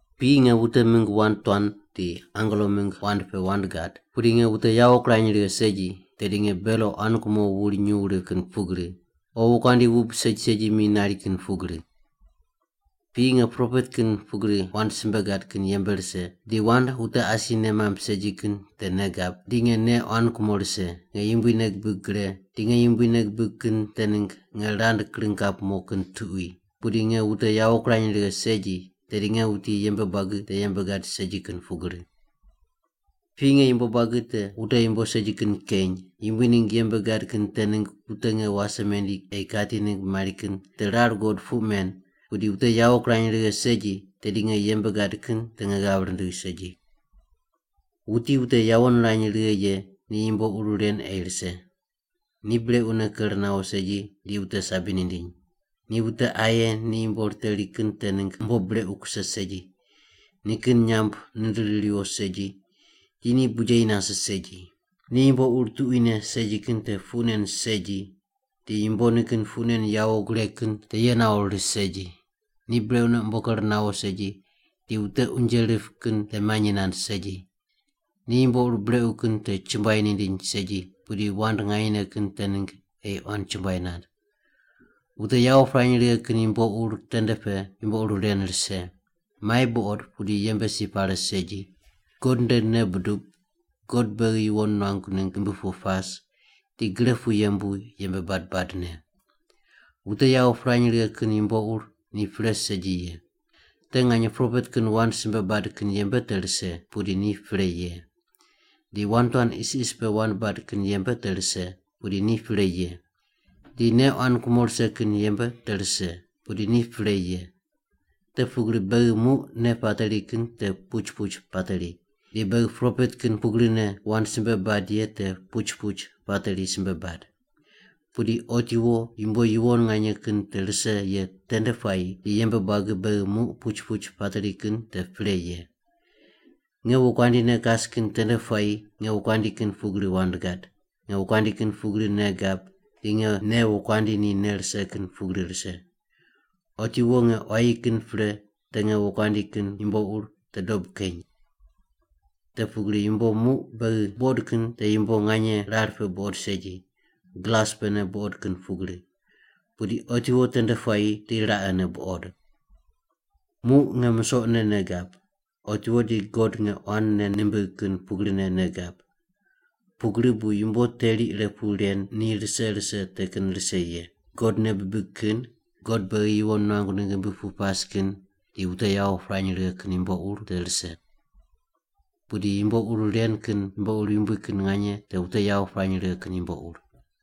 Piyi nge wute mingg wand tuan di angelo mingg wand pe wand gad pudi nge wute yawo kirany righe segi, tedi nge belo quan kumo wuri nyuw rip kin pugri o wokuandi wub segi segi mi nari kin pugri. Piyi nge propet kin pugri wand simbe gad kin yembe rise di wand wute asi nei mamb segi kin te nei gab, di nge nei quan kumo rise, nge Yumbui nei gibig gre di nge Yumbui nei gibig kin te ningg nge rand kring kap mo kin tuqui pudi nge wute yawo kirany righe segi, tedi nge wuti yembe buagi te yembe gad segi kin pugri. Piyi nge yumbo buagi te wute yumbo segi kin keny, Yumbui ningg yembe gad kin te ningg wute nge wase mendi ei kati ningg mari kin te rar guqod puq men pudi wute yawo kirany righe segi, tedi nge yembe gad kin te nge ghav rindigh segi. Wuti wute yawo nirany righe ye ni yumbo ur ren ei rise. Ni brequne ker nawo segi di wute sabi nindiny. Ni wute aye ni yumbo riteri kin te ningg umbo brequ kuse segi, nikin nyamb nindiri riwo segi, di ni bujeyi nase segi. Ni yumbo ur tuquine segi kin te puq nen segi di yumbo nikin puq nen yawo gureg kin te ye nawo ris segi. Ni brequne umbo ker nawo segi di wute unje rip kin te manyi nand segi. Ni yumbo ur brequ kin te chumbuai nindiny segi, pudi wand nganyene kin te ningg ei quan chumbuai nand. Wute yawo pirany righe kin yumbo ur tende pe yumbo ur ren rise: mai buqod pudi yembe si pare segi, God nde nei budub, God beghi yuwon nuangu ningg ghimbi pu pas, di gre pu yembu yembe bad badne. Wute yawo pirany righe kin yumbo ur ni pre segi ye. Te nganye propet kin wand simbe bad kin yembe te rise, pudi ni pre ye. Di wand tuan isis pe wand bad kin yembe te rise, pudi ni pre ye. Di nei quan kumo rise kin yembe te rise, pudi ni pre ye. Te pugri beghi muq nei pateri kin te puch puch pateri, di beghi propet kin pugrine wand simbe bad ye te puch puch pateri simbe bad. Pudi otiwo yumbo yuwon nganye kin te rise ye tende puayi di yembe buagi beghi muq puch puch pateri kin te pre ye. Nge wokuandi ne kas kin tende puayi nge wokuandi kin pugri wand gad, nge wokuandi kin pugri nei gab, di nge nei wokuandi ni nei rise kin pugri rise. Otiwo nge quayi kin pre te nge wokuandi kin yumbo ur te dob keny. Te pugri yumbo muq beghi buqod kin te yumbo nganye rar pe buqod segi, glas pene buqod kin pugri. Pudi otiwo tende puayi di raqene buqod. Muq nge musoqne nei gab, otiwo di God nge quan nei nimbigh kin pugrine nei gab. Pugri bu yumbo teri ire pu ren ni rise rise te kin rise ye. God nei bibig kin, God beghi yuwon nuangu ningg ghimbi pu pas kin, di wute yawo pirany righe kin yumbo ur te rise. Pudi yumbo ur ren kin yumbo yumbui kin nganye te wute yawo pirany righe kin yumbo ur.